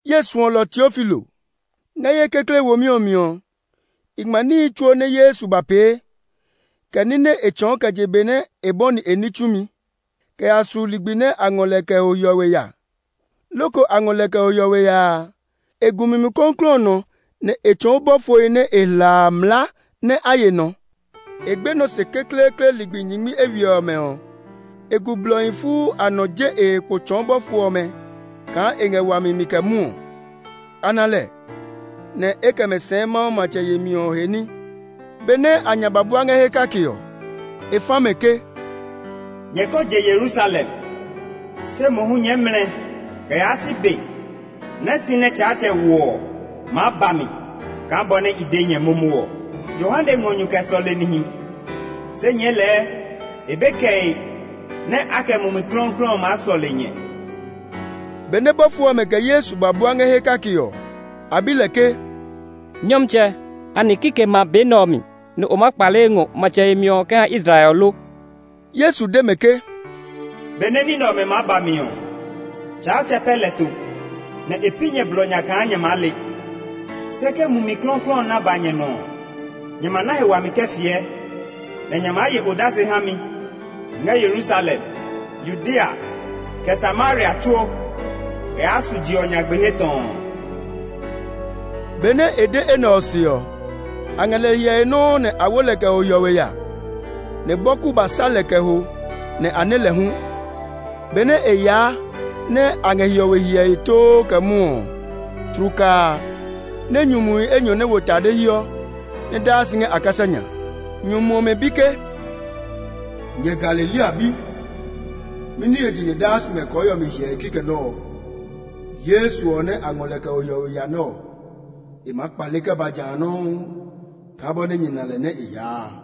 Ye suɔlɔ Teofilo: Ngɛ ye kekle womi ɔ mi ɔ, i ngma níhi tsuo nɛ Yesu ba pee, kɛ ní nɛ e tsɔɔ kɛ je be nɛ e bɔni e ní tsumi, kɛ ya su ligbi nɛ a ngɔ lɛ kɛ ho hiɔwe ya. Loko a ngɔ lɛ kɛ ho hiɔwe ya a, e gu Mumi Klɔuklɔu ɔ nɔ nɛ e tsɔɔ bɔfohi nɛ e hla a mlaa nɛ a ye nɔ. E gbenɔ se kekleekle ligbi nyingmi eywiɛ ɔmɛ ɔ, e gu blɔhi fuu a nɔ je e he kpo tsɔɔ bɔfo ɔmɛ kaa e ngɛ wami mi kɛ mwɔɔ. A na lɛ, nɛ e kɛ mɛ sɛɛ Mawu matsɛ yemi ɔ he ní. Benɛ a nya ba bua ngɛ he kake ɔ, e fa mɛ ke, “Nyɛ ko je Yerusalem; se mohu nyɛɛ mlɛ kɛ yaa si be nɛ si nɛ Tsaatsɛ wo ɔ maa ba mi kaa bɔ nɛ i de nyɛ momo ɔ. Yohane ngɔ nyu kɛ sɔle nihi, se nyɛɛ lɛɛ e be kɛe nɛ a kɛ Mumi Klɔuklɔu ɔ maa sɔle nyɛ.” Benɛ bɔfo ɔmɛ kɛ Yesu ba bua ngɛ he kake ɔ, a bi lɛ ke, “Nyɔmtsɛ, anɛ kikɛmɛ a be nɛ ɔ mi nɛ o maa kpale ngɔ matsɛ yemi ɔ kɛ ha Israel ɔ lo?” Yesu de mɛ ke, “Be nɛ ní nɛ ɔmɛ maa ba mi ɔ, Tsaatsɛ pɛ lɛ to, nɛ e pi nyɛ blɔ nya kaa nyɛ maa le; se ke Mumi Klɔuklɔu ɔ na ba nyɛ nɔ ɔ, nyɛ ma na he wami kɛ fiɛ, nɛ nyɛ maa ye odase ha mi ngɛ Yerusalem, Yudea, kɛ Samaria tsuo kɛ yaa su je ɔ nyagbe he tɔɔ.” Benɛ e de enɛ ɔ se ɔ, a ngɛ lɛ hyɛe nɔuu nɛ a wo lɛ kɛ ho hiɔwe ya, nɛ bɔku ba sa lɛ kɛ ho nɛ a nɛ lɛ hu. Benɛ e yaa nɛ a ngɛ hiɔwe hyɛe too kɛ mwɔɔ ɔ, tlukaa a, ne nyumuhi enyɔ nɛ wo tade hiɔ, nɛ daa si ngɛ a kasa nya. Nyumu ɔmɛ bi ke, “Nyɛ Galilea bi mɛni he je nyɛ daa si ngɛ kɔɔhiɔ mi hyɛe kikɛ nɛ ɔ? Yesu ɔ nɛ a ngɔ kɛ ho hiɔwe ya nɛ ɔ, e maa kpale kɛ ba ja nɔuu kaa bɔ nɛ nyɛ na lɛ nɛ e yaa a.”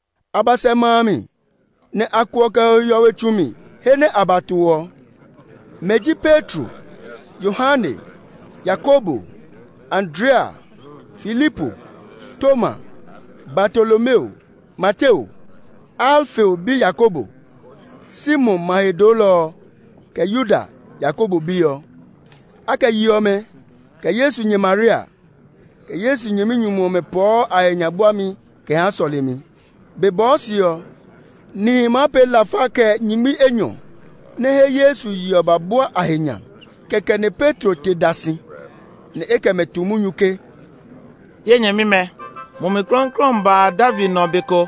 A ba sɛ ma a mi, nɛ a kuɔ kɛ ho hiɔwe tsu mi he nɛ a ba to ɔ. Mɛ ji Petro, Yohane, Yakobo, Andrea, Filipo, Toma, Bartolomeo, Mateo, Alfeo bi Yakobo, Simon ma he doolɔ ɔ, kɛ Yuda, Yakobo bi ɔ. A kɛ yi ɔmɛ, kɛ Yesu nyɛ Maria, kɛ Yesu nyɛminyumu ɔmɛ pɔɔ a he nya buami kɛ ha sɔlemi. Be bɔɔ se ɔ, nihi maa pee lafa kɛ nyingmi enyɔ nɛ he Yesu ye ɔ ba bua a he nya. Kɛkɛ nɛ Petro te da si, nɛ e kɛ mɛ tu munyu ke, “Ye nyɛmimɛ, Mumi Klɔuklɔu ɔ ba David nɔ be ko,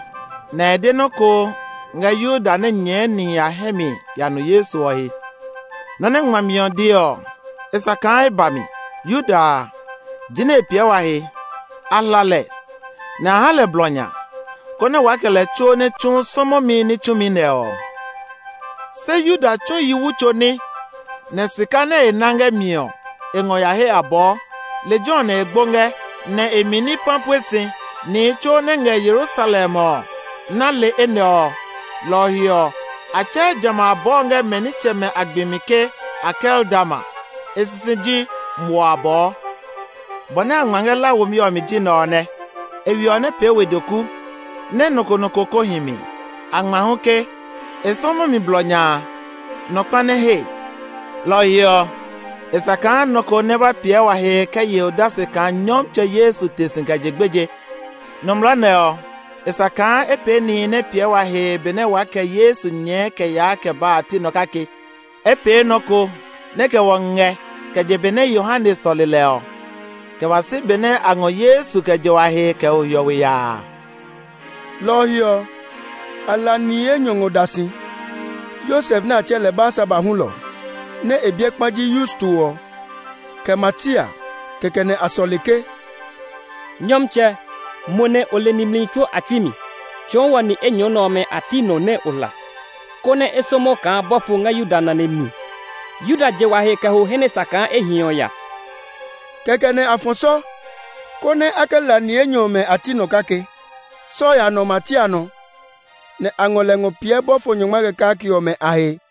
nɛ e de nɔ́ ko ngɛ Yuda nɛ nyɛɛ nihi a hɛ mi ya nu Yesu ɔ he. Nɔ́ nɛ ngmami ɔ de ɔ, e sa kaa e ba mi. Yuda a, jinɛ e piɛ wa he; a hla lɛ, nɛ a ha lɛ blɔ nya, konɛ waa kɛ lɛ tsuo nɛ tsu sɔmɔmi ní tsumi nɛ ɔ.” (Se Yuda tsu yi wu tso ní; nɛ sika nɛ e na ngɛ mi ɔ, e ngɔ ya he abɔɔ. Lejɛ ɔ nɛ e gbo ngɛ, nɛ e mi ni pã pue si. Nihi tsuo nɛ ngɛ Yerusalem ɔ na le enɛ ɔ; lɔ ɔ he ɔ, a tsɛɛ jamɛ a abɔɔ ɔ ngɛ mɛ nitsɛmɛ a gbi mi ke Akeldama. E sisi ji “Muɔ Abɔɔ.”) “Bɔ nɛ a ngma ngɛ La womi ɔ mi ji nɛ ɔ nɛ, ‘E we ɔ nɛ pee we doku, nɛ nɔ ko nɔ ko kó hi mi.’ A ngma hu ke, ‘E sɔmɔmi blɔ nya a, nɔ kpa nɛ he.’ “Lɔ ɔ he ɔ, e sa kaa nɔ ko nɛ ba piɛ wa he kɛ ye odase kaa Nyɔmtsɛ Yesu te si kɛ je gbeje. Nɔmlɔ nɛ ɔ, e sa kaa e pee nihi nɛ piɛ wa he benɛ waa kɛ Yesu nyɛɔ kɛ yaa kɛ baa a a ti nɔ kake. E pee nɔ ko nɛ kɛ wɔ ngɛ kɛ je be nɛ Yohane bɔni fiɛmi ke e sa kaa a sɔle nɔ ɔ, kɛ ba si be nɛ a ngɔ Yesu kɛ je wa he kɛ ho hiɔwe ya a.” Lɔ ɔ he ɔ, a hla ni enyɔ ngɔ da si, Yosef nɛ a tsɛɛ lɛ Barsaba hulɔ, nɛ e biɛ kpa ji Yusto ɔ, kɛ Matia. Kɛkɛ nɛ a sɔle ke, “Nyɔmtsɛ, mo nɛ o le nimli tsuo a tsui mi, tsɔɔ wɔ ni enyɔ nɛ ɔmɛ a ti nɔ nɛ o hla, konɛ e sɔmɔ kaa bɔfo ngɛ Yuda nane mi. Yuda je wa he kɛ ho he nɛ sa kaa e hi ɔ ya.” Kɛkɛ nɛ a fɔ sɔ, konɛ a kɛ hla ni enyɔ ɔmɛ a ti nɔ kake. Sɔ ɔ ya nɔ Matia nɔ; nɛ a ngɔ lɛ ngɔ piɛ bɔfo nyɔngma kɛ kake ɔmɛ a he.